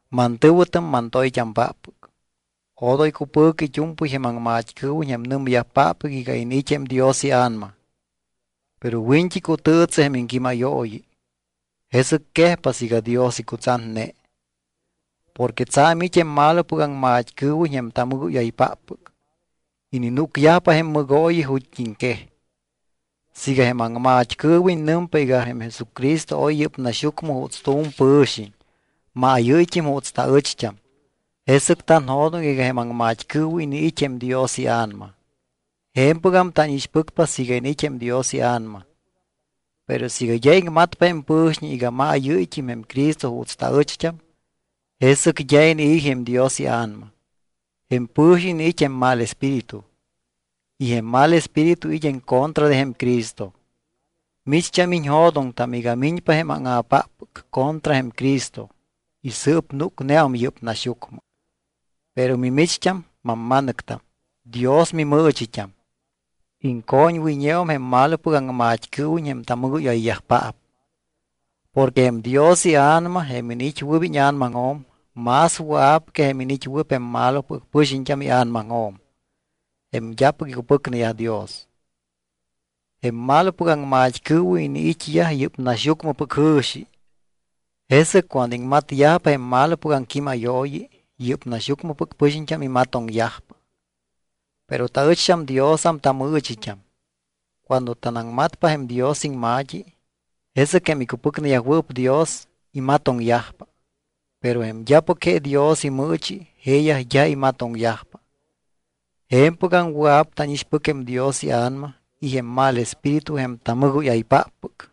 Mantɨ̱wɨtam mantoyt́ampáppɨc, odoy cupɨ̱cɨ it́u̱mpɨy jém aŋmat́cɨɨwiñ jém nɨmyajpáppɨc iga iniit́ jém Dios iA̱nama. Pero wiñt́i cutɨɨtsɨ jém iŋquímayooyi, jesɨc quejpa siiga Dios icutsatne. Porque tsa̱m it́ jém malopɨc aŋmat́cɨɨwiñ jém tamɨgóyaypáppɨc. Ininúcyajpa jém mɨgooyi ju̱t́iŋquej. Siiga jém aŋmat́cɨɨwiñ nɨmpa iga jém Jesucristo oy yɨ́p naxyucmɨ juuts tu̱m pɨ̱xiñ, maayɨ́yt́im juuts taɨcht́am, jesɨc tanjo̱doŋ iga jém aŋmat́cɨɨwiñ iniit́ jém Dios iA̱nama. Je̱mpɨgam tánixpɨcpa siiga iniit́ jém Dios iA̱nama. Pero siiga d́a iŋmatpa jém pɨ̱xiñ iga maayɨ́yt́im jém Cristo juuts taɨcht́am, jesɨc d́a inii̱ jém Dios iA̱nama. Jém pɨ̱xiñ iniit́ jém mal espíritu. Y jém mal espíritu it́ en contra de jém Cristo. Micht́am iñjo̱doŋtam iga miñpa jém áŋa̱páppɨc contra jém Cristo y sɨɨp núcneum yɨ́p naxyucmɨ. Pero mimicht́am, mamma̱nɨctam, Dios mimɨɨchit́am. Iŋcoñwɨyñeum jém malopɨc aŋmat́cɨɨwiñ jém tamɨgóyayyajpaap. Porque jém Dios iA̱nama, jém iniit́wɨɨp íña̱namaŋjo̱m, más wɨa̱p que jém iniit́wɨɨp jém malopɨc pɨxiñt́am ia̱namaŋjo̱m, jém d́apɨc icupɨcneyaj Dios. Jém malopɨc aŋmat́cɨɨwiñ iniit́yaj yɨ́p naxyucmɨpɨc jɨ̱xi, jesɨc cuando iŋmatyajpa jém malopɨc aŋquímayooyi, yɨ́p naxyucmɨpɨc pɨxiñt́am imatoŋyajpa. Pero taɨcht́am Diosam tamɨɨchit́am. Cuando tanaŋmatpa jém Dios iŋma̱t́i, jesɨc jém icupɨcneyajwɨɨp Dios imatoŋyajpa. Pero jém d́apɨc je Dios imɨɨchi jeeyaj d́a imatoŋyajpa. Je̱mpɨgam wɨa̱p tánixpɨc jém Dios iA̱nama y jém mal espíritu jém tamɨgóyaypáppɨc.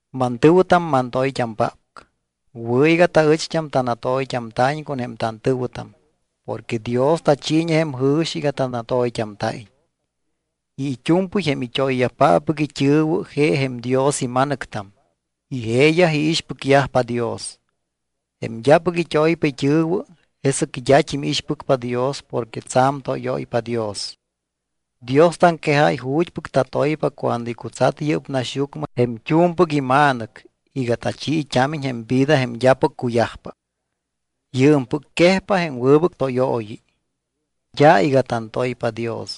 Mantɨ̱wɨtam mantoyt́ampáppɨc, wɨ̱ iga taɨcht́am tanatoyt́amta̱iñ con jém tantɨ̱wɨtam porque Dios tachiiñe jém jɨ̱xi iga tanatoyt́amta̱iñ. Y it́u̱mpɨy jém it́oyyajpáppɨc it́ɨ̱wɨ je jém Dios ima̱nɨctam y jeeyaj iixpɨcyajpa Dios. Jém d́apɨc it́oypa it́ɨ̱wɨ jesɨc d́at́im iixpɨcpa Dios porque tsa̱m tóyóypa Dios. Dios taŋquejáy ju̱t́pɨc tatoypa cuando icutsat yɨ́p naxyucmɨ jém t́u̱mpɨc iMa̱nɨc iga tachiit́ámiñ jém vida jém d́apɨc cuyajpa. Yɨɨmpɨc quejpa jém wɨbɨc tóyooyi. D́a iga tantoypa Dios,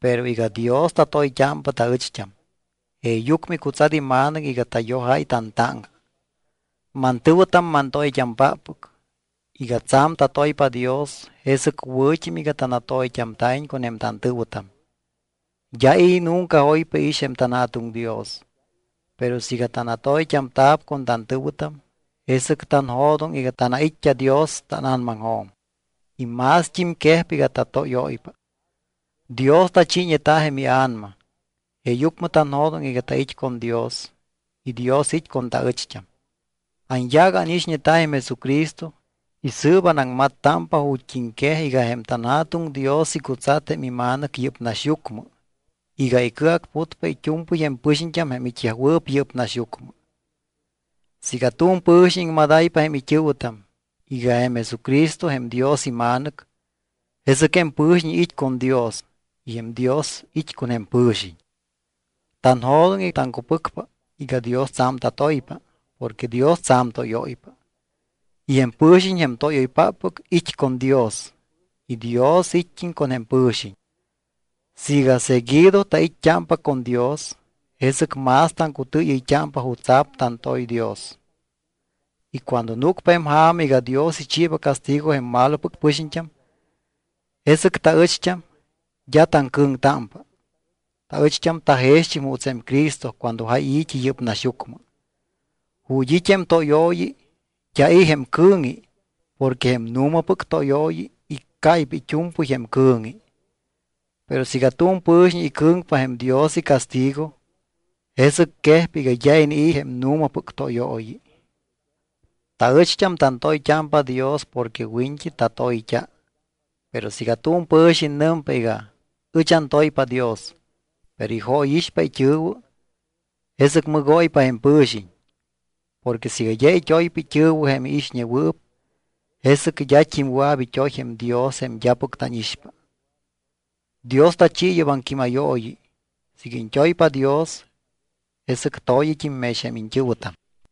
pero iga Dios tatoyt́ámpa taɨcht́am. Jeeyucmɨ icutsat iMa̱nɨc iga tayojáy tantáŋca. Mantɨ̱wɨtam mantoyt́ampáppɨc, iga tsa̱m tatoypa Dios jesɨc wɨ̱t́im iga tanatoyt́amta̱iñ con jém tantɨ̱wɨtam. D́a i̱ nunca oypa iix jém tanJa̱tuŋ Dios, pero siiga tanatoyt́amta̱p con tantɨ̱wɨtam, jesɨc tanjo̱doŋ iga tanait́t́a Dios tána̱namaŋjo̱m. Y mást́im quejpa iga tatóyóypa. Dios tachiiñeta jém iA̱nama, jeeyucmɨ tanjo̱doŋ iga tait́ con Dios y Dios it́ con taɨcht́am. Anyaac ánixñeta jém Jesucristo y sɨɨp anaŋmattámpa ju̱t́iŋquej iga jém tanJa̱tuŋ Dios icutsat jém iMa̱nɨc yɨ́p naxyucmɨ iga icɨacputpa it́u̱mpɨy jém pɨxiñt́am jém it́yajwɨɨp yɨ́p naxyucmɨ. Siiga tu̱m pɨ̱xiñ iŋmadáypa jém it́ɨ̱wɨtam iga jém Jesucristo jém Dios iMa̱nɨc, jesɨc jém pɨ̱xiñ it́ con Dios y jém Dios it́ con jém pɨ̱xiñ. Tanjo̱doŋ y taŋcupɨcpa iga Dios tsa̱m tatoypa porque Dios tsa̱m tóyóypa. Y jém pɨ̱xiñ jém tóyoypáppɨc it́ con Dios y Dios it́t́im con jém pɨ̱xiñ. Siiga seguido tait́t́ámpa con Dios, jesɨc más taŋcutɨɨyɨyt́ámpa jutsa̱p tantoy Dios. Y cuando núcpa jém ja̱ma iga Dios ichiiba castigo jém malopɨc pɨxiñt́am, jesɨc taɨcht́am d́a taŋcɨ̱ŋtámpa. Taɨcht́am tajext́im juuts jém Cristo cuando jáy i̱t́i yɨ́p naxyucmɨ. Ju̱t́ it́ jém tóyooyi d́a i̱ jém cɨ̱ŋi porque jém nu̱mapɨc tóyooyi iccáypa it́u̱mpɨy jém cɨ̱ŋi. Pero siiga tu̱m pɨ̱xiñ icɨ̱ŋpa jém Dios icastigo, jesɨc quejpa iga d́a inii̱ jém nu̱mapɨc tóyooyi. Taɨcht́am tantoyt́ámpa Dios porque wiñt́i tatoyt́a. Pero siiga tu̱m pɨ̱xiñ nɨmpa iga: Ɨch antoypa Dios, pero ijóyixpa it́ɨ̱wɨ, jesɨc mɨgóypa jém pɨ̱xiñ. Porque siiga d́a it́oypa it́ɨ̱wɨ jém iixñewɨɨp, jesɨc d́at́im wɨa̱p it́oy jém Dios jém d́apɨc tánixpa. Dios tachi yɨ́p aŋquímayooyi: “Siiga iñt́oypa Dios, jesɨc to̱yɨt́im mex jém iñt́ɨ̱wɨtam.”